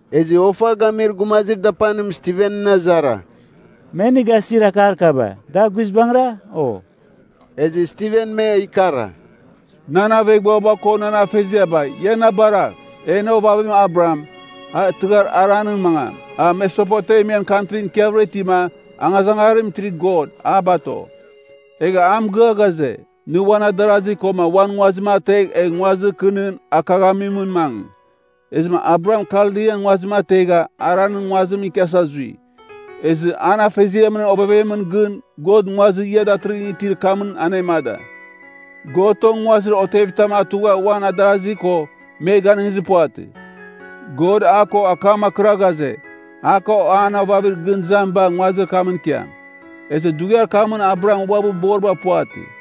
Ezɨ ofa gamir gumazir dapanim Stivenɨn azara, “Me nɨ gasir akar kaba, da guizbangɨra, o?” Ezɨ Stiven me ikara, “Nan aveghbuaba ko nan afeziaba ia na baragh! En ovavim Abraham, a tɨghar Haranɨn mangam, a Mesopotemian kantri ikiavɨra itima angazangarim itir God, a bato. Egha a mɨgɨa ghaze, ‘Nɨ uan adarazi koma uan nguazim ategh egh nguazir kɨ nɨn akaghamimɨn mangɨ.’ “Ezɨma Abraham Kaldian nguazim ategha Haranɨn nguazimɨn ikiasa zui. Ezɨ an afeziamɨn ovevemɨn gɨn God nguazir ia datɨrɨghɨn itir kamɨn anemada. God tong nguazir otevitam atugha a uan adarazi ko, me ganɨngizir puvatɨ. God a ko akam akɨra ghaze, a ko an ovavir gɨn izamiba nguazir kamɨn ikiam. Ezɨ dughiar kamɨn Abraham uabɨ boriba puvatɨ.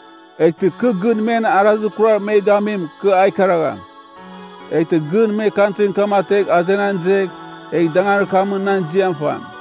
Eghtɨ kɨ gɨn men arazir kurar me gamim kɨ a ikaragham. Eghtɨ gɨn me kantrin kam ategh azenan izegh, egh danganir kamɨn nan ziam fam.’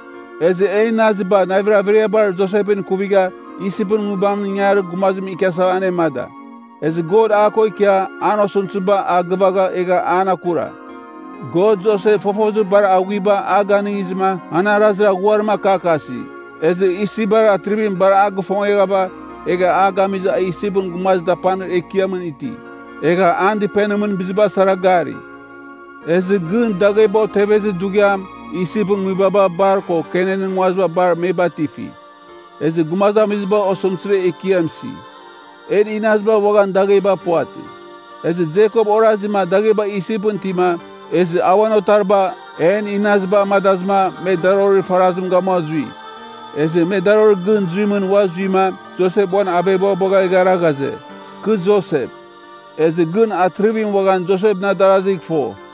“Ezɨ en inaziba navir averiabar Josepɨn ikuvigha Isipɨn nguibamɨn ingarir gumazimɨn ikiasava anemada. Ezɨ God a ko ikia an osɨmtɨziba a gɨvagha egha an akura. God Josep fofozir bar aghuiba a ganɨngizɨma an arazir aghuarim akakasi, ezɨ Isipbar atrivim bar a gifongeghava egha a gamizɨ a Isipɨn gumazir dapanir ekiamɨn iti. Egha an dɨpenimɨn biziba sara gari. “Ezɨ gɨn dagheba otevezir dughiam Isipɨn nguibaba bar ko Kenanɨn nguaziba bar me batifi. Ezɨ gumazamiziba osɨmtɨzir ekiam isi. En inaziba uaghan dagheba puvatɨ. Ezɨ Jekop orazima dagheba Isipɨn itima, ezɨ a uan otariba, en inaziba amadazɨma me darorir farazim gamua zui. Ezɨ me darorir gɨn zuimɨn ua zuima Josep uan aveghbuabagh eghara ghaze, ‘Kɨ Josep.’ Ezɨ gɨn atrivim uaghan Josepɨn adarazigh fo.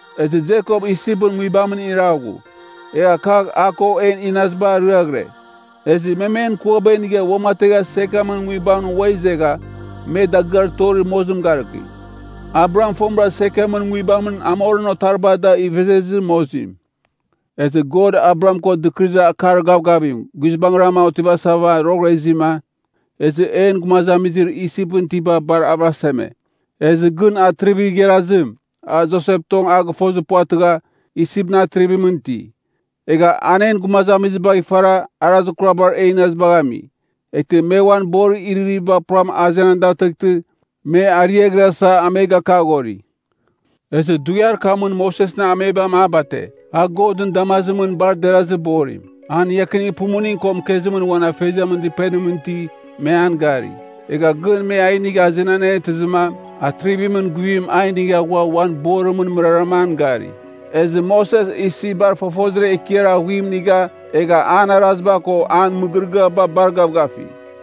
Ezɨ Jekop Isipɨn nguibamɨn iraghu. Egha kagh a ko en inaziba ariaghɨre. Ezɨ me men kuaba inigha uamategha Sekemɨn nguibamɨn ua izegha me dagɨar torir mozim garɨki, Abraham fomɨra Sekemɨn nguibamɨn Hamorɨn otariba da ivezezir mozim. “Ezɨ God Abraham ko dɨkɨrɨzir akar gavgavim guizbangrama otivasava roghɨra izima, ezɨ en gumazamizir Isipɨn itiba bar avɨraseme. Ezɨ gɨn atrivir igharazim, a Josep tong a gɨfozir puvatɨgha, Isipɨn atrivimɨn iti. Egha an en gumazamizibagh ifara arazir kurabar en inazibagh ami. Eghtɨ me uan borir iririviba puram azenan datɨghtɨ, me ariaghrasa a me gakaghori. “Ezɨ dughiar kamɨn Mosesɨn amebam a bate, a Godɨn damazimɨn bar derazir borim. An iakinir pumuning ko mɨkezimɨn uan afeziamɨn dɨpenimɨn iti, me an gari. Egha gɨn me a inigha azenan anetɨzɨma, atrivimɨn guivim a inigha ghua uan borimɨn mɨrarama an gari. Ezɨ Moses Isipbar fofozir ekiar aghuim inigha egha an araziba ko an mɨgɨrɨgɨaba bar gavgafi.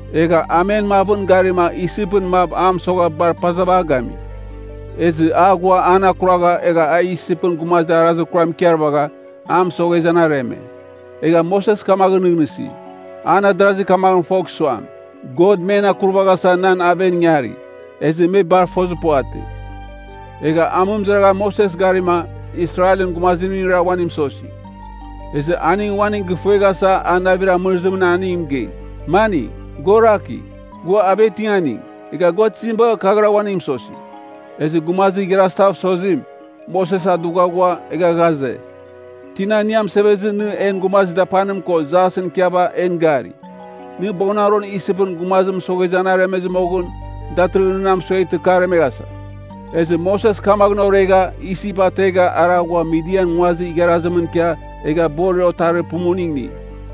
Egha a men mavɨn garima Isipɨn mav a mɨsogha bar pazava a gami. Ezɨ a ghua an akuragha, egha a Isipɨn gumazim arazir kuram ikarvagha, a mɨsoghezɨ an areme. Egha Moses kamaghɨn nɨghnɨsi, an adarazi kamaghɨn fogh suam, God men akurvaghasa nan aven ingari. Ezɨ me bar fozir puvatɨ. Egha amɨmɨzaraghan Moses garima Israelɨn gumazimningra uaning mɨsosi. Ezɨ aning uaning gɨfueghasa a navir amɨrɨzimɨn aning mɨgei, ‘Maning, gua orakigh, gua avetinganing, egha gua tizim bagha kaghɨra uaning mɨsosi?’ “Ezɨ gumazir igharazitav sozim, Moses a dugha ghua, egha ghaze, ‘Tina nɨ amɨsevezɨ nɨ en gumazir dapanim ko jasɨn ikiava en gari? Nɨ boghɨnaron Isipɨn gumazir mɨsoghezɨ an aremezɨ moghɨn, datɨrɨghɨn na mɨsueghtɨ kɨ aremeghasa?’ Ezɨ Moses kamaghɨn oregha Isip ategha ara ghua Midian nguazir igharazimɨn ikia egha borir otarir pumuning ini.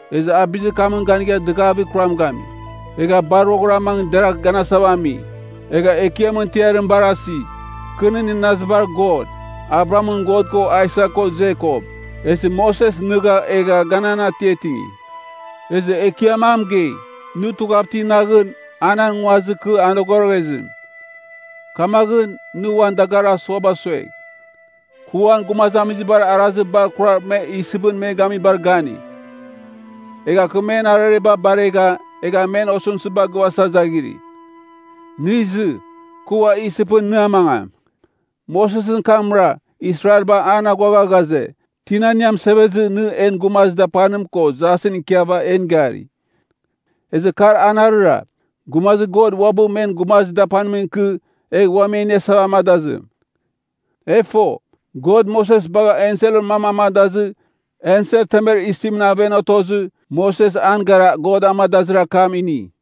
Ezɨ a bizir kamɨn ganigha dɨgavir kuram gami. Egha bar roghɨra mangɨ deragh ganasava ami, egha Ekiamɨn tiarim barasi, ‘Kɨ nɨn inazibar God, Abrahamɨn God ko Aisak ko Jekop.’ Ezɨ Moses nɨgha egha ganan atiatingi. “Ezɨ Ekiam a mɨgei, ‘Nɨ tughav iti naghɨn, a nan nguazir kɨ a anogoroghezim. Kamaghɨn, nɨ uan dagarir asuaba suegh. Kɨ uan gumazamizibar arazir bar kurar me Isipɨn me gamibar gani. Egha kɨ men arareba baregha, egha men osɨmtɨziba gɨvasa izaghiri. Nɨ izɨ, kɨ ua Isipɨn nɨ amangam.’ “Mosesɨn kamra Israelba an aghuagha ghaze, ‘Tina nɨ amɨsevezɨ nɨ en gumazir dapanim ko jasɨn ikiava en gari?’ Ezɨ kar anarɨra, gumazir God uabɨ men gumazir dapanimɨn ikɨ egh ua me iniasava amadazim. E fo, God Moses bagha enselɨn mam amadazɨ ensel temer isim aven otozɨ Moses an gara God amadazir akam ini.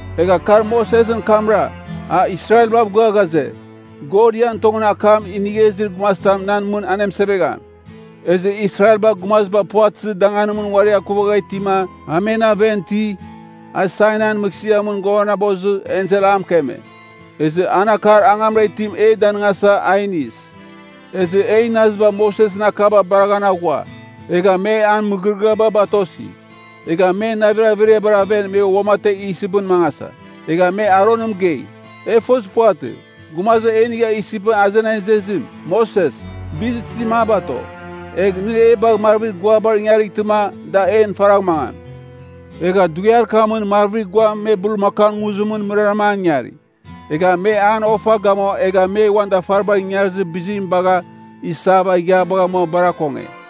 “Egha kar Mosesɨn kamra, a Israelbav gɨa ghaze, ‘God ian tongɨn akam inigh izir gumazitam nan mɨn anemɨsevegham.’ Ezɨ Israelba gumaziba puvatɨzir danganimɨn uari akuvagha itima a men aven iti, a Sainaian mɨghsɨamɨn ghuavanabozɨ ensel a mɨkeme. Ezɨ an akar angamra itim e danɨngasa, a inis. “Ezɨ en inaziba Mosesɨn akaba baraghan aghua. Egha me an mɨgɨrɨgɨaba batosi. Egha men navir averiabar aven me uamategh Isipɨn mangasa. Egha me Aronɨn mɨgei, ‘E fozir puvatɨ, gumazir e inigha Isipɨn azenan izezim, Moses, bizir tizim a bato. Egh, nɨ e bagh marvir guabar ingarightɨma da en faragh mangam.’ Egha dughiar kamɨn marvir guam me bulmakaun nguzimɨn mɨrarama an ingari. Egha me an ofa gamua egha me uan dafaribar ingarizir bizim bagha isava ighiabagh amua bar akonge.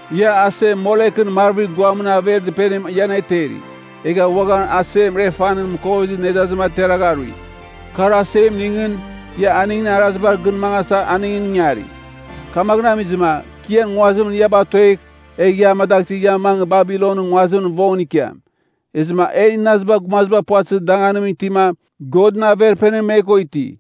Ia asem Molekɨn marvir guamɨn aver dɨpenim ia aneteri, egha uaghan asem Refanɨn mɨkovezir nedazim ateragha arui. Kar asemningɨn, ia aningɨn arazibar gɨn mangasa aningɨn ingari. Kamaghɨn amizɨma, kɨ ian nguazimɨn ia batoegh, egh ia amadaghtɨ ia mangɨ Babilonɨn nguazimɨn vongɨn ikiam.’ “Ezɨma en inaziba gumaziba puvatɨzir danganimɨn itima Godɨn Averpenim me ko iti.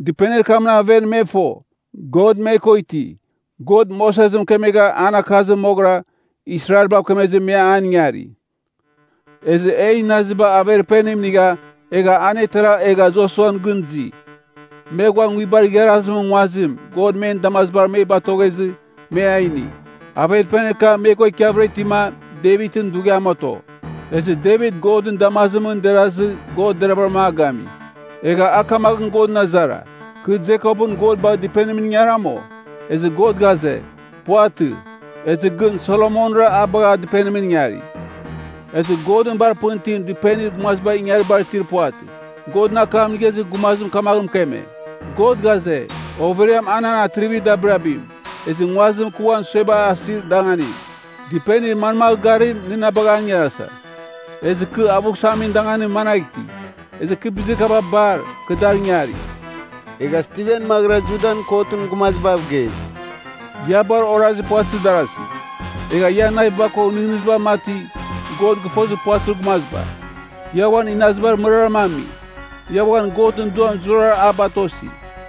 Dɨpenir kamɨn aven me fo, God me ko iti. God Moses mɨkemegha an akazim moghɨra, Israelbav kemezɨ me an ingari. Ezɨ en inaziba Averpenim inigha, egha anetera egha Josuan gɨn izi. Me ghua nguibar igharazimɨn nguazim, God men damazibar me batoghezɨ, me a ini. Averpenir kam me ko ikiavɨra itima Devitɨn dughiam oto. Ezɨ Devit Godɨn damazimɨn derazɨ God deravɨram a gami. Egha a kamaghɨn Godɨn azara, ‘Kɨ Jekopɨn God bagh dɨpenimɨn ingaram, o?’ Ezɨ God ghaze, ‘Puvatɨ.’ Ezɨ gɨn Solomonra a bagha dɨpenimɨn ingari. “Ezɨ Godɨn bar pɨn itim dɨpenir gumaziba ingaribar itir puvatɨ. Godɨn akam inigha izir gumazim kamaghɨn mɨkeme, ‘God ghaze, overiam a nan atrivir dabirabim. Ezɨ nguazim kɨ uan suebar asir danganim. Dɨpenir manmagh garim, nɨ na bagha an ingarasa? Ezɨ kɨ avughsamin danganim managh iti? Ezɨ bizir kaba bar, kɨ dar ingari.’” Egha Stiven maghɨra Judan kotɨn gumazibav gei, “Ia bar orazir puvatɨzir darasi! Egha ian naviba ko nɨghnɨziba mati, God gɨfozir puvatɨzir gumaziba! Ia uan inazibar mɨrarama ami! Ia uaghan Godɨn Duam zurara a batosi!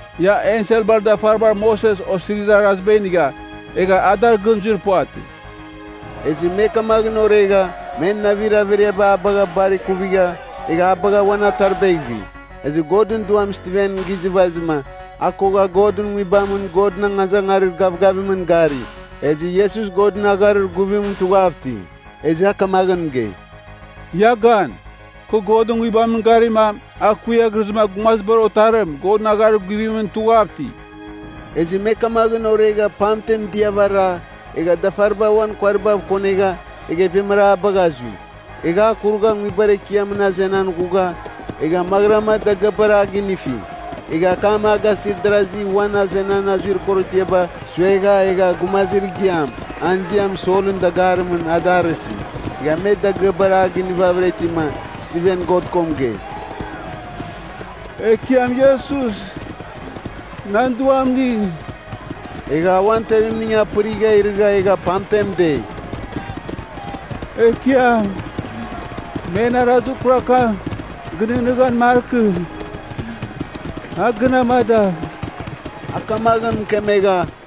Ia enselbar dafaribar Moses Osirizir Araziba inigha, egha a dar gɨn zuir puvatɨ.” Ezɨ me kamaghɨn oregha, men navir averiaba a bagha bar ikuvigha egha a bagha uan ataribagh ivi. Ezɨ Godɨn Duam Stiven gizɨvazɨma, a kogha Godɨn Nguibamɨn Godɨn angazangarir gavgavimɨn gari, ezɨ Iesus Godɨn agharir guvimɨn tughav iti. Ezɨ a kamaghɨn mɨgei, “Ia Gan! Kɨ Godɨn Nguibamɨn garima, a kuiaghrɨzɨma Gumazibar Otarim Godɨn agharir guvimɨn tughav iti.” Ezɨ me kamaghɨn oregha pamtem diava ara, egha dafaribar uan kuaribav kongegha, egha ivemara a bagha zui. Egha a kurugha nguibar ekiamɨn azenan ghugha, egha maghɨrama dagɨabar a ginifi. Egha akam a gasir darasi uan azenan azuir korotiaba suegha egha gumazir igiam, an ziam Solɨn dagarimningɨn a da arɨsi. Egha me dagɨabar a ginivavɨra itima, Stiven God ko mɨgei, “Ekiam Iesus, nan duam inigh.” Egha a uan tevimning apɨrigha irɨgha egha pamtem dei, “Ekiam, men arazir kurar kam gɨnɨghnɨghan markɨ, a gɨn amadagh.” A kamaghɨn mɨkemegha,